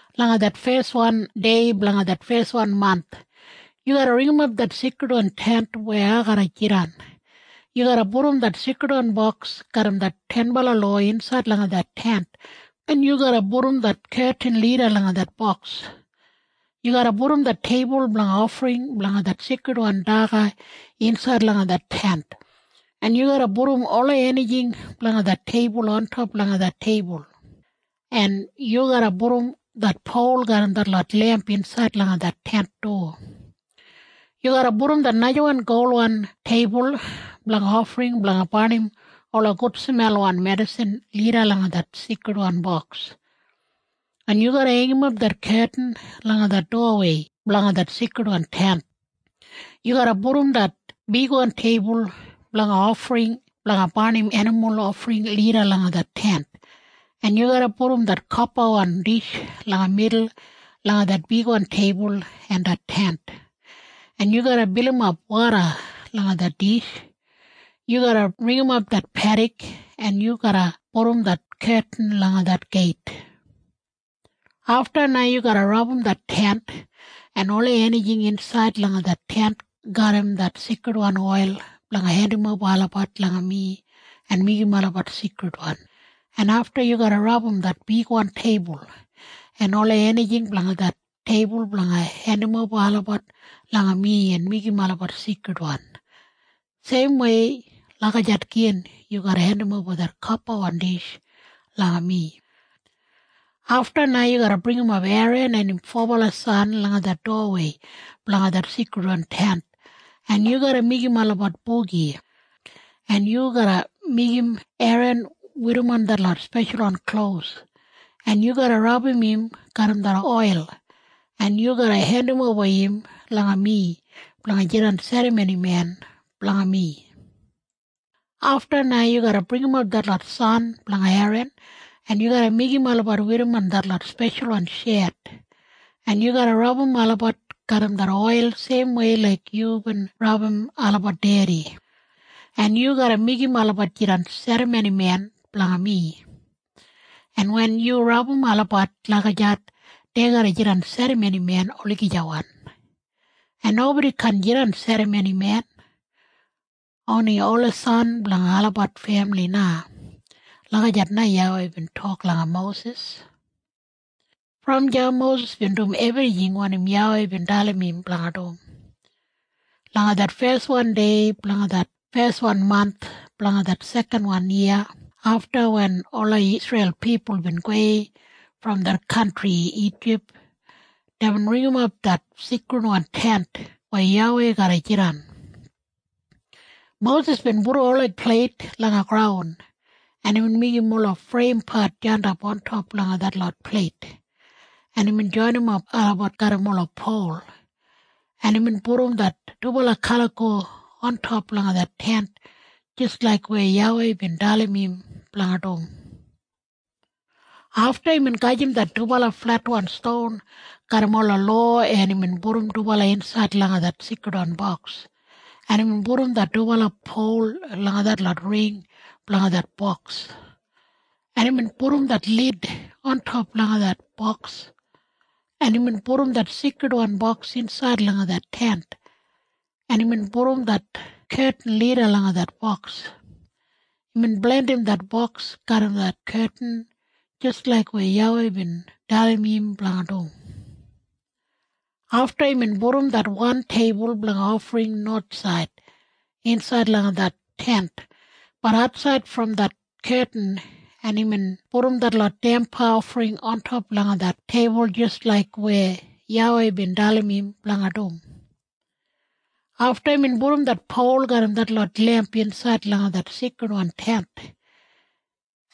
“Langa det feswan dei blanga det feswan manth yu garra ringimap det Seikridwan Tent weya ai garra jidan. Yu garra pudum det Seikridwan Boks garram det Tenbala Lowa insaid langa det Tent, en yu garra pudum det ketin lida langa det boks. Yu garra pudum det teibul blanga ofring blanga det seikridwan daga insaid langa det Tent, en yu garra pudum ola enijing blanga det teibul ontop langa det teibul, en yu garra pudum det pol garram detlot lemp insaid langa det Tent du. Yu garra pudum det najawan golwan teibul blanga ofring blanga barnim ola gudsmelwan medisin lida langa det Seikridwan Boks, en yu garra heingimap det ketin langa det dowawei blanga det Seikridwan Tent. Yu garra pudum det bigwan teibul blanga ofring blanga barnim enimul ofring lida langa det Tent, en yu garra pudum det kopawan dish langa midul langa det bigwan teibul en det Tent, en yu garra bilimap woda langa det dish. Yu garra ringimap det pedik, en yu garra pudum det ketin langa det geit. “Afta na yu garra rabum det Tent en ola enijing insaid langa det Tent garram det seikridwan oil blanga hendimoba olabat langa mi en meigim olabat seikridwan, en afta yu garra rabum det bigwan teibul en ola enijing blanga det teibul blanga hendimoba olabat langa mi en meigim olabat seikridwan. Seimwei lagijat gin yu garra hendimoba det kopawan dish langa mi. “Afta na yu garra bringimap Eran en im fobala san langa det dowawei blanga det Seikridwan Tent, en yu garra meigim olabat bogi, en yu garra meigim Eran werrimon detlot speshalwan klos, en yu garra rabum im garram det oil, en yu garra hendimoba im langa mi blanga jidan serramonimen blanga mi. “Afta na yu garra bringimap detlot san blanga Eran, en yu garra meigim olabat werrimon detlot speshalwan shet, en yu garra rabum olabat garram det oil seimwei laik yubin rabum olabat dedi, en yu garra meigim olabat jidan serramonimen blanga mi. En wen yu rabum olabat lagijat, dei garra jidan serramonimen olagijawan, en nobodi kaan jidan serramonimen. Oni ola san blanga olabat femili na.” Lagijat na YAWEI bin tok langa Mosis. Brom deya Mosis bin dum ebrijing wanim YAWEI bin dalim im blanga dum. Langa det feswan dei blanga det feswan manth blanga det sekanwan yiya afta wen ola Isreil pipul bin gowei brom det kantri Ijip, deibin ringimap det Seikridwan Tent weya YAWEI garra jidan. Mosis bin pudum ola pleit langa graun, en imbin meigim ola freimpat jandap ontop langa detlot pleit, en imbin joinimap olabat garram ola pol, en imbin pudum det dubala kaliko ontop langa det Tent jis laik weya YAWEI bin dalim im blanga dum. Afta imbin gajim det dubala fletwan ston garram ola lowa, en imbin pudum dubala insaid langa det Seikridwan Boks, en imbin pudum det dubala pol langa detlot ring blanga det boks, en imbin pudum det lid ontop langa det boks, en imbin pudum det Seikridwan Boks insaid langa det Tent, en imbin pudum det ketin lida langa det boks. Imbin blandim det boks garram det ketin jis laik weya YAWEI bin dalim im blanga dum. Afta imbin pudum det wan teibul blanga ofring nowathsaid insaid langa det Tent, bat atsaid brom det ketin, en imbin pudum detlot damba ofring ontop langa det teibul jis laik weya YAWEI bin dalim im blanga dum. Afta imbin pudum det pol garram detlot lemp insaid langa det Seikridwan Tent.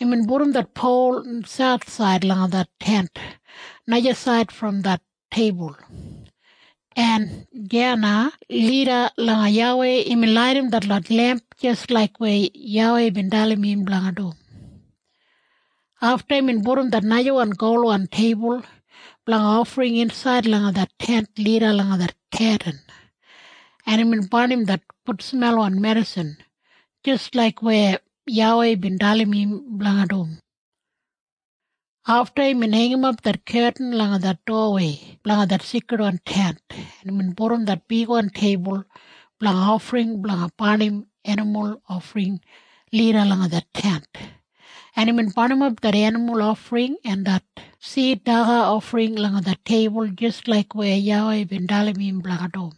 Imbin pudum det pol sauthsaid langa det Tent najasaid brom det teibul, en deya na lida langa YAWEI imbin laidim detlot lemp jis laik weya YAWEI bin dalim im blanga dum. Afta imbin pudum det najawan golwan teibul blanga ofring insaid langa det Tent lida langa det ketin, en imbin barnim det gudsmelwan medisin jis laik weya YAWEI bin dalim im blanga dum. Afta imbin heingimap det ketin langa det dowawei blanga det Seikridwan Tent, en imbin pudum det bigwan teibul blanga ofring blanga barnim enimul ofring lida langa det Tent, en imbin barnimap det enimul ofring en det sid daga ofring langa det teibul jis laik weya YAWEI bin dalim im blanga dum.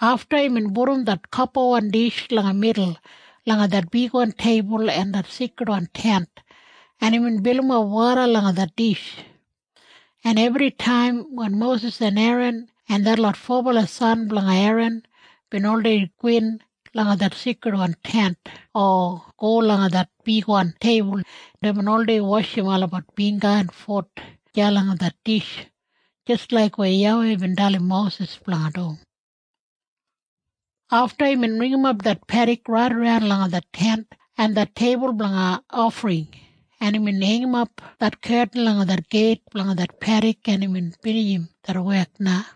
Afta imbin pudum det kopawan dish langa midul langa det bigwan teibul en det Seikridwan Tent, en imbin bilimap woda langa det dish, en ebritaim wen Mosis en Eran en detlot fobala san blanga Eran bin oldei gowin langa det Seikridwan Tent o go langa det bigwan teibul, deibin oldei washim olabat bingga en fut deya langa det dish jis laik weya YAWEI bin dalim Mosis blanga dum. Afta imbin pudumap det pedik raidaran langa det Tent en det teibul blanga ofring, en imbin heingimap det ketin langa det geit blanga det pedik, en imbin binijimap det wek na.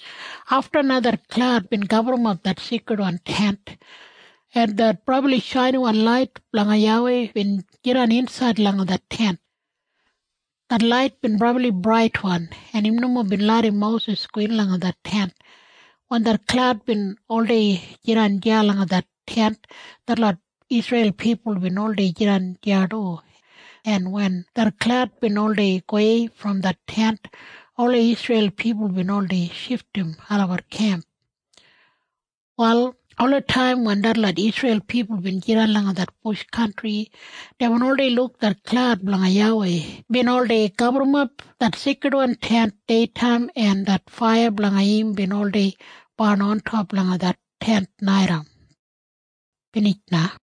Afta na det klaud bin gaburrumap det Seikridwan Tent, en det brabli shainiwan lait blanga YAWEI bin jidan insaid langa det Tent. Det lait bin brabli braitwan, en im nomo bin larram Mosis gowin langa det Tent. Wen det klaud bin oldei jidan deya langa det Tent, detlot Isreil pipul bin oldei jidan deya du, en wen det klaud bin oldei gowei brom det Tent, ola Isreil pipul bin oldei shifdim olabat kemp. Wal olataim wen detlot Isreil pipul bin jidan langa det bush kantri, deibin oldei luk det klaud blanga YAWEI bin oldei gaburrumap det Seikridwan Tent deitaim en det faiya blanga im bin oldei barn ontop langa det Tent naitaim. Binij na.